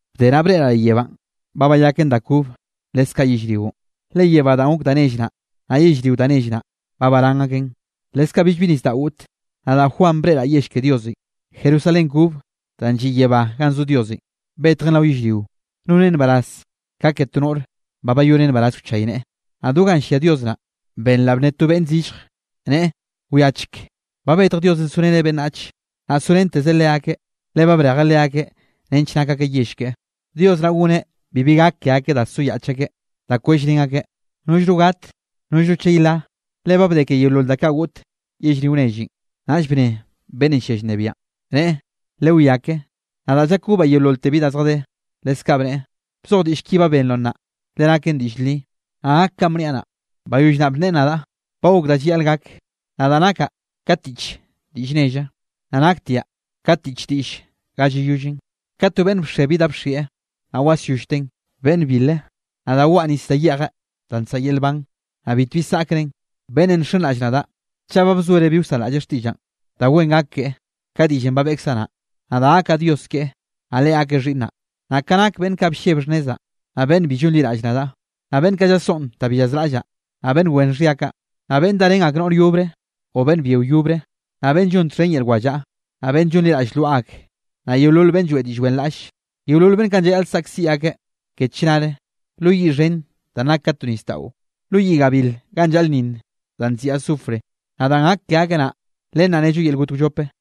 Bde naꞌ breꞌraꞌ leꞌ yebánꞌ ba bayaken da kobe leskaꞌ yellrionꞌ, le yebánꞌ da gok da nelle naꞌ, naꞌ yellrio da nell naꞌ ba barán aken. Leskaꞌ billbi nisdaꞌo goꞌte. Nadaꞌ Juan breꞌraꞌ yell ke Diosenꞌ, Jerusalén kobe danꞌ lliꞌ yebánꞌ ganꞌ zo Diosenꞌ, betjen rao yellrio. Nonen nbaraz ka ke to noꞌre ba bayoneꞌ nbaraz wchayneꞌe. Naꞌ do ganꞌ llia Dios naꞌ, benraꞌ bnne to beꞌnn zillje, neꞌe: —Wiacheke, ba betj Diosenꞌ zoreneꞌ beꞌnnach, naꞌ sorentezeꞌ leakeꞌ, le brejeꞌ leakeꞌ nench nak akeꞌ yell keꞌe. Dios naꞌ goneꞌ bibi gak ke akeꞌ da soyaꞌch akeꞌ, da kwellrén akeꞌ, nollno gat, nollno chey la, le ba bde ke yeolol da kaꞌ goꞌt yellrio nellenꞌ. Naꞌll bne beꞌnnenꞌ llia llnebiaꞌn, neꞌe: —Lewiá ke, nadaꞌ llakobaꞌ yeololte bi da zjadé. Leskaꞌ bneꞌe: —Bzoj diꞌll ki ba benroꞌ naꞌ, le naken diꞌll li, naꞌ gak kanꞌ bniaꞌ naꞌ. Bayoll naꞌ bneꞌe nadaꞌ: —Ba gok da llayaꞌl gak. Nadaꞌ nakaꞌ ka tiꞌch diꞌll nelle, naꞌ naktiaꞌ ka tiꞌch diꞌll ga llayollen, ka to beꞌnn bxe bi da bxieꞌ, naꞌ wasyollteꞌn. Beꞌnne bile, nadaꞌ weꞌe nis da yeꞌjeꞌ danꞌ nsaꞌa yel nban, naꞌ bitbi saꞌkren. Beꞌnne nxenraꞌll nadaꞌ, chaꞌ ba bzoereꞌ bi wsanraꞌlleꞌ xtiꞌllaꞌn, da wen gak keꞌe ka diꞌllenꞌ ba beꞌkzaꞌ naꞌ, nadaꞌ gakaꞌ Dios keꞌe, naꞌ leꞌe gakeꞌ xhiꞌnnaꞌ. Naꞌ ka nak beꞌnn kaꞌ blleb xhnnezaꞌ, naꞌ beꞌnn bi llonliraꞌll nadaꞌ, naꞌ beꞌnn kaꞌ llasoꞌn danꞌ bi llazraꞌllaꞌ, naꞌ beꞌnn wen xhia kaꞌ, naꞌ beꞌnn darén ak noꞌr yobre o beꞌnn byio yobre, naꞌ beꞌnn llon txhen yel wallaꞌa, naꞌ beꞌnn llonliraꞌll lwaꞌa ak, naꞌ yeolol beꞌnn lloeꞌ diꞌll wenraꞌlle; yeolol beꞌnn kaꞌn llayaꞌl saꞌkziꞌ akeꞌ ke chnare lo yiꞌ xhen danꞌ nak ka to nisdaꞌo, lo yiꞌ gabil ganꞌ llaꞌlnninn danꞌ nziꞌi azufre. Naꞌ danꞌ gak ke akeꞌ naꞌ, len naꞌ nello yel got wllope.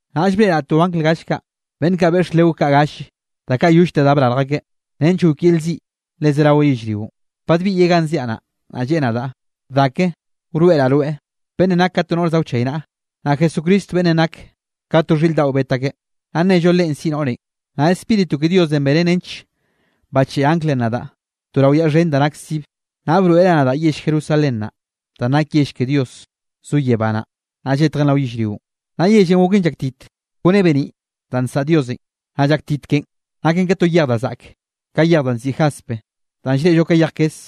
Naꞌll breꞌraꞌ to angl gall kaꞌ beꞌnn kaꞌ beꞌx leo kaꞌ galle, da kaꞌ yollte da brarj akeꞌ, nench gok yel ziꞌ le zerawe yellrionꞌ. Badbiꞌyeꞌ ganꞌ ziaꞌ naꞌ, naꞌ lleꞌe nadaꞌ: —Da ke, wroeꞌraꞌ rweꞌ beꞌnnenꞌ nak ka to noꞌr za wchaynaꞌa, naꞌ Jesucristo beꞌnnenꞌ nak ka to xhiꞌr daꞌon bet akeꞌ, naꞌ nnello Leꞌen siꞌi noꞌrenꞌ. Naꞌ Spíritu ke Diosenꞌ benen nench bacheꞌe anglenꞌ nadaꞌ to rao yaꞌ xhen da nak sibe, naꞌ broeꞌreꞌ nadaꞌ yell Jerusalén naꞌ, danꞌ nake yell ke Dios. Zon yebá naꞌ, naꞌ lletjen rao yellrionꞌ. Naꞌ yellenꞌ goken llaktit kone beniꞌ danꞌ nsaꞌa Diosenꞌ. Naꞌ llaktit ken naken ka to yej da zaꞌke, ka yej danꞌ nziꞌi jaspe danꞌ llreꞌllo ka yej kes.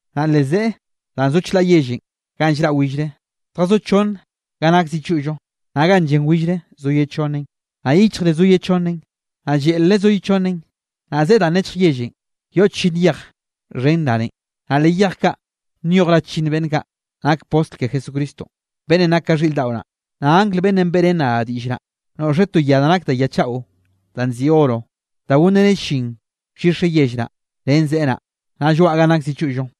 Naꞌ leꞌ zeꞌe danꞌ zo chlaꞌ yellenꞌ ganꞌ llraꞌ willre zjazó chonne ganꞌ nak zi choꞌllo, naꞌ ganꞌ llen willre zo ye chonnen, naꞌ yichjre zo ye chonnen, naꞌ lleꞌlre zo ye chonnen. Naꞌ zeꞌe danꞌ nechj yellenꞌ, yoꞌ chllinn yej xhen rane, naꞌ leꞌ yej kaꞌ nyoj ra chllinn beꞌnn kaꞌ nak postl ke Jesucristo beꞌnnenꞌ nake ka xhiꞌr daꞌo naꞌ. Naꞌ angl beꞌnnenꞌ beꞌrén nadaꞌ diꞌll naꞌ, noꞌxeꞌ to ya da nak de ya chaꞌo danꞌ nziꞌi oro da gonreneꞌ llin wllixeꞌ yell naꞌ, ren zeꞌe naꞌ, naꞌ lloaꞌ ganꞌ nak zi choꞌllo.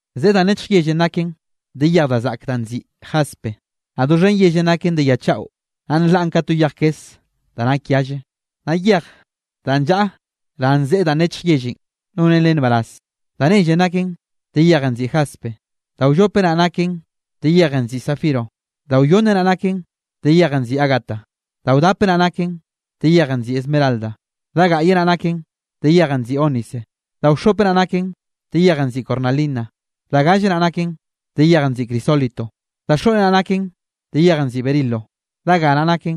Zeꞌe danꞌ nechj yellenꞌ naken de yej da zaꞌke da nziꞌi jaspe, naꞌ doxhen yellenꞌ naken de ya chaꞌo, naꞌ nlaꞌn ka to yej kes da nak yalle. Naꞌ yej danꞌ llaꞌa ran zeꞌe danꞌ nechj yellenꞌ nonen len nbaraz. Da nellenꞌ naken de yejenꞌ nziꞌi jaspe; da wllope naꞌ naken de yejenꞌ nziꞌi zafiro; da wyonne naꞌ naken de yejenꞌ nziꞌi ágata; da wdape naꞌ naken de yejenꞌ nziꞌi esmeralda; da gaꞌye naꞌ naken de yejenꞌ nziꞌi ónice; da wxhope naꞌ naken de yejenꞌ nziꞌi cornalina; da galle naꞌ naken de yejenꞌ nziꞌi crisólito; da xoꞌne naꞌ naken de yejenꞌ nziꞌi berilo; da ga naꞌ naken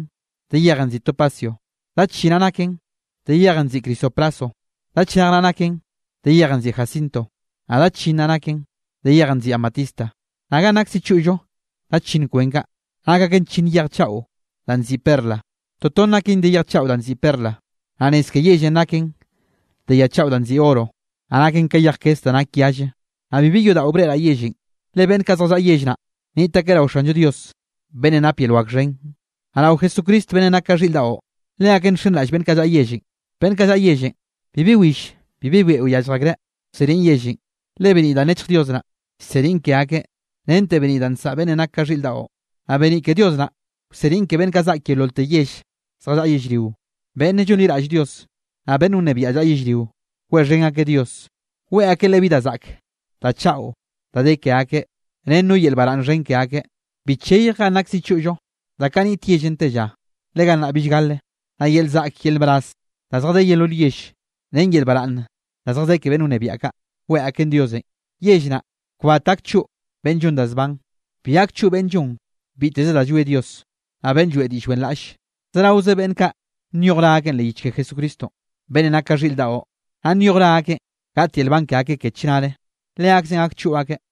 de yejenꞌ nziꞌi topacio; da chi naꞌ naken de yejenꞌ nziꞌi crisopraso; da chnej naꞌ naken de yejenꞌ nziꞌi jacinto; naꞌ da chllinn naꞌ naken de yejenꞌ nziꞌi amatista. Naꞌ ganꞌ nak zi choꞌllo da chllinn kwen kaꞌ, nak aken chllinn yej chaꞌo danꞌ nziꞌi perla, toton naken de yej chaꞌo nziꞌi perla. Naꞌ nez ke yellenꞌ naken de ya chaꞌo danꞌ nziꞌi oro, naꞌ naken ka yej kes da nak yalle. Naꞌ bibi yodaꞌo breꞌraꞌ yellenꞌ, le beꞌnn kaꞌ zjallaꞌa yell naꞌ, niꞌt akeꞌ rao Xanllo Dios, beꞌnnenꞌ nape yel wak xhen, naꞌ rao Jesucristo beꞌnnenꞌ nak ka xhiꞌr daꞌo, leakeꞌn nxenraꞌll beꞌnn kaꞌ llaꞌa yellenꞌ. Beꞌnn kaꞌ llaꞌa yellenꞌ, bibi will bibi beꞌo yallj akreꞌ wseniꞌn yellenꞌ, le beniꞌ danꞌ nechj Dios naꞌ, llseniꞌn ke akeꞌ rente beniꞌ da nsaꞌa beꞌnnenꞌ nak ka xhiꞌr daꞌo. Naꞌ beniꞌ ke Dios naꞌ wseniꞌn ke beꞌnn zaꞌk yeololte yell zjallaꞌa yellrio, beꞌnne llonliraꞌll Dios, naꞌ beꞌnn wnebiaꞌ llaꞌa yellrio weꞌxhen akeꞌ Dios, weꞌe akeꞌ Leꞌe bi da zaꞌke da chaꞌo da de ke akeꞌ, ren no yel baraꞌnn xhen ke akeꞌ. Bi cheyj ganꞌ nak zi choꞌllo da kaꞌ niꞌt yellenꞌ te lla, le gannaꞌ bill gale. Naꞌ yel zaꞌk yel nbaraz da zjadé yeolol yell, ren yel baraꞌnn da zjadé ke beꞌnn wnebiaꞌ kaꞌ, weꞌe akeꞌn Diosenꞌ. Yell naꞌ kbat gak choꞌ beꞌnn llon da zban. Bi gak choꞌ beꞌnne llon biteze da llwie Dios, naꞌ beꞌnne lloeꞌ diꞌll wenraꞌlle. Zeraoze beꞌnne kaꞌ nyoj ra akeꞌn leꞌ yich ke Jesucristonꞌ, beꞌnnenꞌ nak ka xhiꞌr daꞌo, naꞌ nyoj ra akeꞌ gaꞌt yel nban ke akeꞌ ke chnare, leakzeꞌn gak choꞌ akeꞌ.